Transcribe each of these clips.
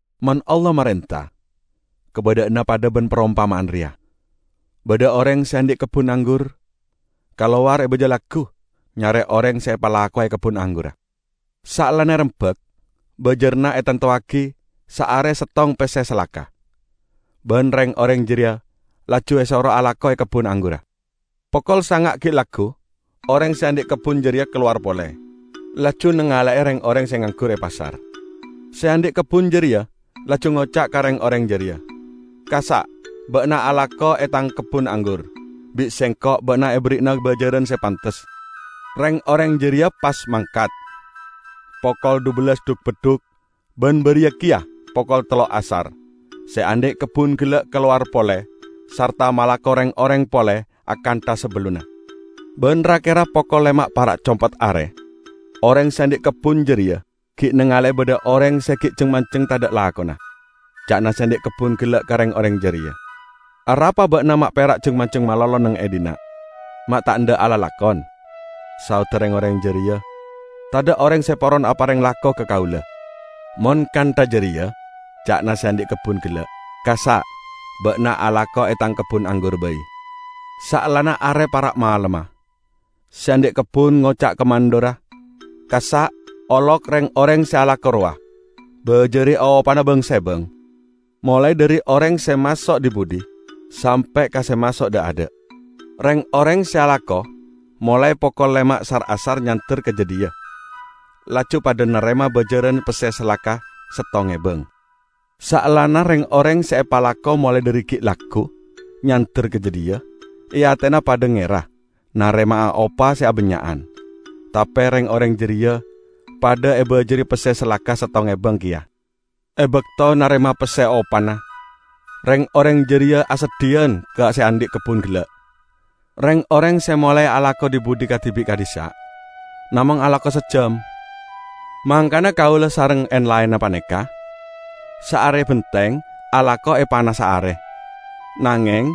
"Mon Allah marenta, kabadha'anna padha ban parompama'an reya: Badha oreng se andhi' kebbun anggur kalowar e baja laggu nyare oreng se epalakowe e kebbun anggurra. Saellana erembak, bajaranna etantowagi saare settong pesse salaka, ban reng-oreng jareya laju esoro alako e kebbun anggurra. Pokol sanga' gi' laggu oreng se andhi' kebbun jareya kalowar pole, laju nangale'e reng-oreng se nganggur e pasar. Se andhi' kebbun jareya laju ngoca' ka reng-oreng jareya, 'Kassa' ba'na alako e tang kebbun anggur. Bi' sengko' ba'na eberri'ana bajaran se pantes.' Reng-oreng jareya pas mangkat. Pokol dhubellas dhuk-beddhuk ban bariya keya pokol tello' asar, se andhi' kebbun gella' kalowar pole sarta malako reng-oreng pole akantha sabellunna. Ban ra-kera pokol lema' para' compet are, oreng se andhi' kebbun jareya gi' nangale'e badha oreng se gi' jeng-manjeng tadha' lakona. Ca'na se andhi' kebbun gella' ka reng-oreng jareya, 'Arapa ba'na ma' pera' jeng-manjeng malolo neng e dhinna' ma' ta' endha' alalakon?' Saodda reng-oreng jareya, 'Tadha' oreng se poron apareng lako ka kaula.' 'Mon kantha jareya,' ca'na se andhi' kebbun gella', 'kassa' ba'na alako e tang kebbun anggur bai.' Saellana are para' malemma, se andhi' kebbun ngoca' ka mandhurra, 'Kassa' olok reng-oreng se alako rowa, bajari opana bang-sebang, molae dhari oreng se maso' dhi-budhi sampe' ka se maso' dha'-adha'.' Reng-oreng se alako molae pokol lema' sar-asar nyander ka jadhiya laju padha narema bajaran pesse salaka settong ebang. Saellana reng-oreng se epalako molae dhari gi' laggu nyander ka jadhiya, e atena padha ngera narema'a opa se abannya'an. Tape reng-oreng jareya padha ebajari pesse salaka settong ebang keya. E bakto narema pesse opana, reng-oreng jareya aseddhiyan ka se andhi' kebbun gella', 'Reng-oreng se molae alako dhi-budhi kadibi' ka'dhissa' namong alako saejjam. Mangkana kaula sareng en-laenna paneka saare benteng alako e panassa are, nangeng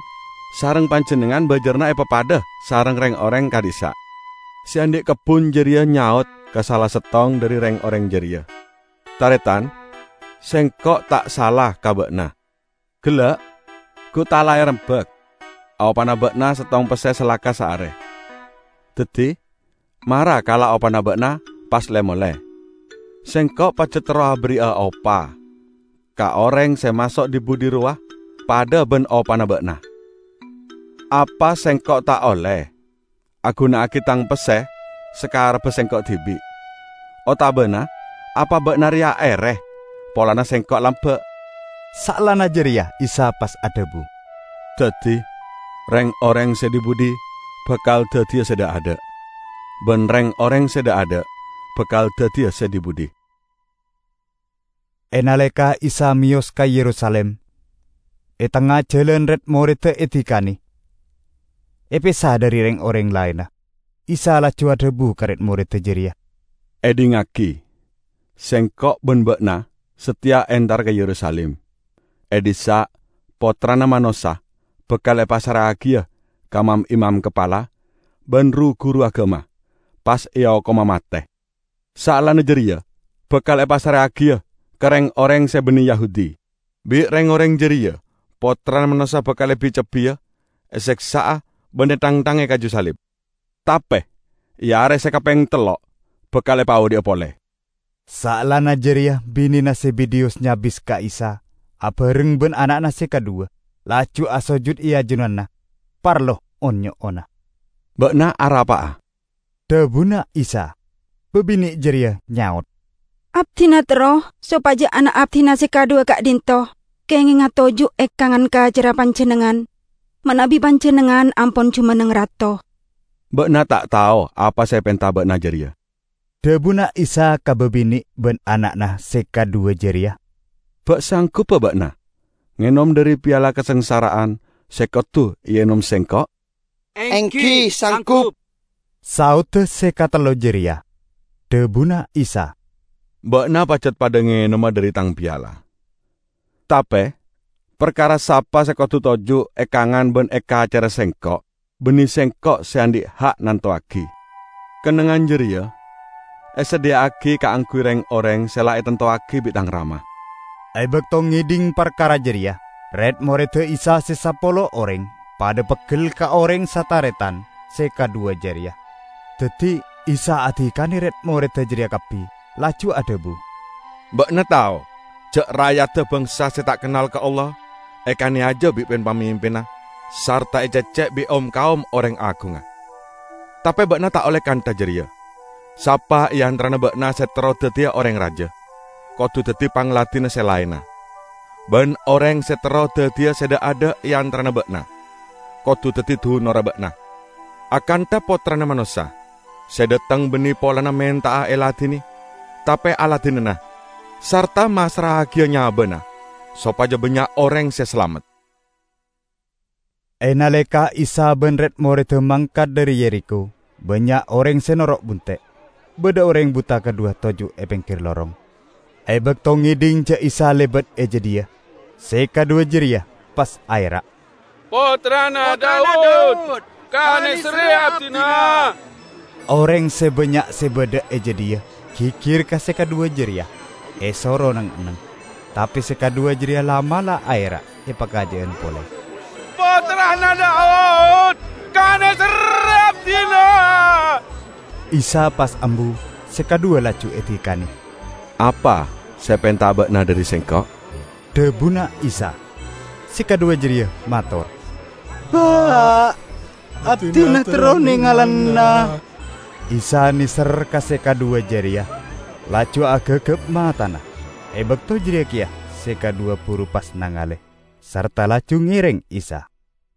sareng panjennengngan bajaranna epapadha sareng reng-oreng ka'dhissa'!' Se andhi' kebbun jareya nyaot ka sala settong dhari reng-oreng jareya, 'Taretan, sengko' ta' sala ka ba'na. Gella' gu ta' la erembak opana ba'na settong pesse salaka saare? Daddi, mara kala' opana ba'na, pas le-mole. Sengko' pajat terro aberri'a opa ka oreng se maso' dhi-budhi rowa padha ban opana ba'na. Apa sengko' ta' olle aguna'agi tang pesse sakarebba sengko' dibi'? Otabana apa ba'na reya ere, polana sengko' lamba'?' " Saellana jareya Isa pas adhabu, "Daddi reng-oreng se dhi-budhi bakal daddiya se dha'-adha', ban reng-oreng se dha'-adha' bakal daddiya se dhi-budhi." E naleka Isa meyos ka Yerusalim, e tengnga jalan red-moredda edikane, epesa dhari reng-oreng laenna. Isa laju adhabu ka red-moredda jareya, "Edhingngagi! Sengko' ban ba'na sateya entara ka Yerusalim. E dhissa' Pottrana Manossa bakal epassra'agiya ka mam-imam kapala ban ru-guru agama, pas eokoma mate, saellana jareya bakal epassra'agiya ka reng-oreng se banne Yahudi. Bi' reng-oreng jareya Pottrana Manossa bakal ebi-cebbiya, eseksa'a ban ethangthanga e kaju salib. Tape e are se kapeng tello' bakal epaodhi'a pole." Saellana jareya binena Zebedeyus nyabis ka Isa abareng ban ana'na se kadhuwa, laju asojud e ajunanna parlo on-nyo'ona. "Ba'na arapa'a?" dhabuna Isa. Babine' jareya nyaot, "Abdina terro sopaja ana' abdina se kadhuwa ka'dhinto' kengenga toju' e kangan kacerra Panjennengngan manabi Panjennengngan ampon jumenneng Rato." "Ba'na ta' tao apa se epenta ba'na jareya," dhabuna Isa ka babine' ban ana'na se kadhuwa jareya. "Ba' sangguba ba'na ngenom dhari piala kasangsa'ra'an se kodu eenom Sengko'?" "Enggi, sanggup," saodda se katello jareya. Dhabuna Isa, "Ba'na pajat padha ngenoma dhari Tang piala. Tape parkara sapa se kodu toju' e kangan ban e kacerra Sengko', banne Sengko' se andhi' ha' nantowagi. Kennengngan jareya esadhiya'agi kaangguy reng-oreng se la etantowagi bi' Tang Rama." E bakto ngedhing parkara jareya, red-moredda Isa se sapolo oreng padha peggel ka oreng sataretan se kadhuwa jareya. Daddi Isa adikane red-moredda jareya kabbi laju adhabu, "Ba'na tao ja' ra'yadda bangsa se ta' kennal ka Allah ekaneyaja bi' pin-pamimpinna sarta ececce' bi' om-kaom oreng agungnga. Tape ba'na ta' olle kantha jareya. Sapa e antarana ba'na se terro daddiya oreng raja, kodu daddi pangladinna se laenna. Ban oreng se terro daddiya se dha'adha' e antarana ba'na, kodu daddi dunorra ba'na. Akantha Pottrana Manossa, se dhateng banne polana menta'a eladine, tape aladinana, sarta massra'agiya nyabana sopaja bannya' oreng se salamet." E naleka Isa ban red-moredda mangkat dhari Yerikho, bannya' oreng se noro' bunte'. Badha oreng buta kadhuwa toju' e penggir lorong. E bakto ngedhing ja' Isa lebat e jadhiya, se kadhuwa jareya pas aera', "Pottrana Daud, kaneserre abdina!" Oreng se bannya' se badha e jadhiya gigir ka se kadhuwa jareya, esoro neng-enneng. Tape se kadhuwa jareya la'-mala' aera' epakaja'an pole. "Pottrana Daud, kaneserre abdina!" Isa pas ambu, se kadhuwa laju edikane. "Apa se epenta'a ba'na dhari Sengko'?" dhabuna Isa. Se kadhuwa jareya mator, "Pa', abdina terro nengalana." Isa neser ka se kadhuwa jareya, laju agagap matana. E bakto jareya keya se kadhuwa buru se nangale, sarta laju ngereng Isa.